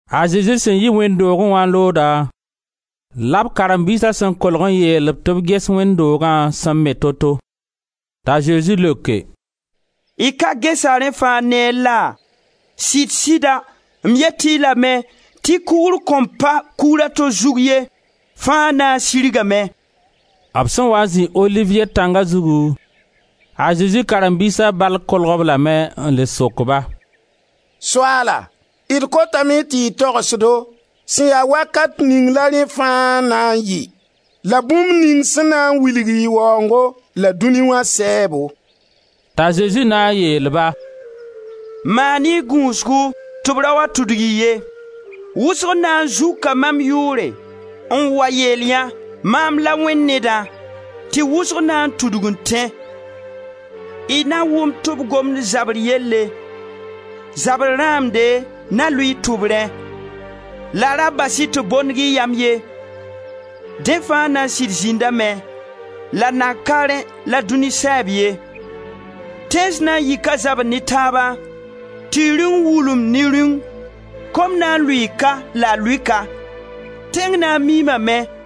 A Zezi sẽn yi wẽnd doogẽ wã n looda, la b karen-biisa sẽn kolg n yeel-b tɩ b ges wẽnd dooga sẽn me to-to. T'a Zezi leoke: «Y ka gesa rẽ fãa neer la? Sɩd-sɩda m yet-y lame tɩ kugr kõn pa kugra to zug ye, fãa na n sirgame.» B sẽn waa n zĩ Oliviye tãnga zugu, a Zezi karen-biisa bal kolg-b lame n le sok-ba: «Soaala, d kotame tɩ y togs-do sẽn ya wakat ning la rẽ fãa na n yɩ la bũmb ning bũmb ning sẽn na n wilg y waoongo la dũni wã sɛɛbo.» T'a Zezi na n yeel-ba: «Maan-y gũusgu tɩ b ra wa tudg-y ye. Wʋsg na n zuka mam yʋʋre n wa yeelyã: ‹Mam la Wẽnd Nedã,› tɩ wʋsg na n tudg n tẽ. Y na wʋm tɩ b gomd zabr yelle, zabr rãamde na lʋɩ y tʋbrẽ, la ra bas-y tɩ b bondg y yam ye. Dẽ fãa na n sɩd zĩndame la nan ka rẽ la dũni sɛɛb ye. Tẽns na n yika zabr ne taaba, tɩ rĩung wulumd ne rĩung; kom na n lʋɩɩ ka la a lʋɩ ka, tẽng na n miimame,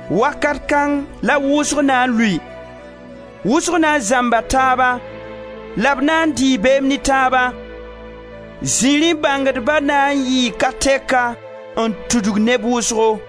Wakat kãng la wʋsg na n lʋɩ. Wʋsg na n zãmba taaba la b na n dɩɩ beem ne taaba. Zirẽ bãngdba na n yɩɩ ka tɛka n tudg neb wʋsgo.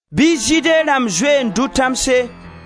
bɩ Zɩɩde rãmb zoe n dʋ tãmse;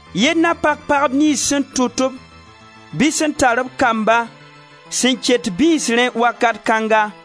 Yell na pak pagb niyns sẽn tʋt-b, bɩ sẽn tar b kamba sẽn ket bĩsrẽ wakat kãnga.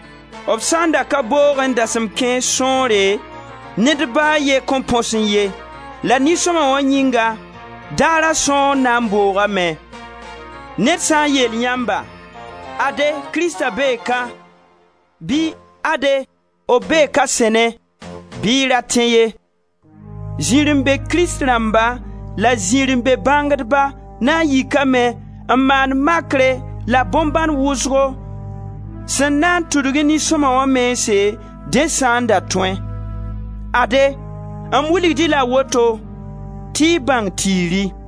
B sã n da ka boogẽ dasem kãens sõore, ned ba a ye kõn põsẽ ye, la nin-sõma wã yĩnga, daara sõor na n boogame. Ned sã n yeel yãmba: ‹Ade, Krista bee ka,› bɩ: ‹Ade, b bee ka sẽnẽ,› bɩ y ra tẽ ye. Zirẽ-be-krist rãmba la zirẽ-be-bãngdba na n yikame n maan makre la bõn-bãn wʋsgo sẽn na n tudgẽ nin-sõma wã mense, dẽ sã n da tõẽ. Ade, m wilg-y la woto tɩ y bãng tiiri.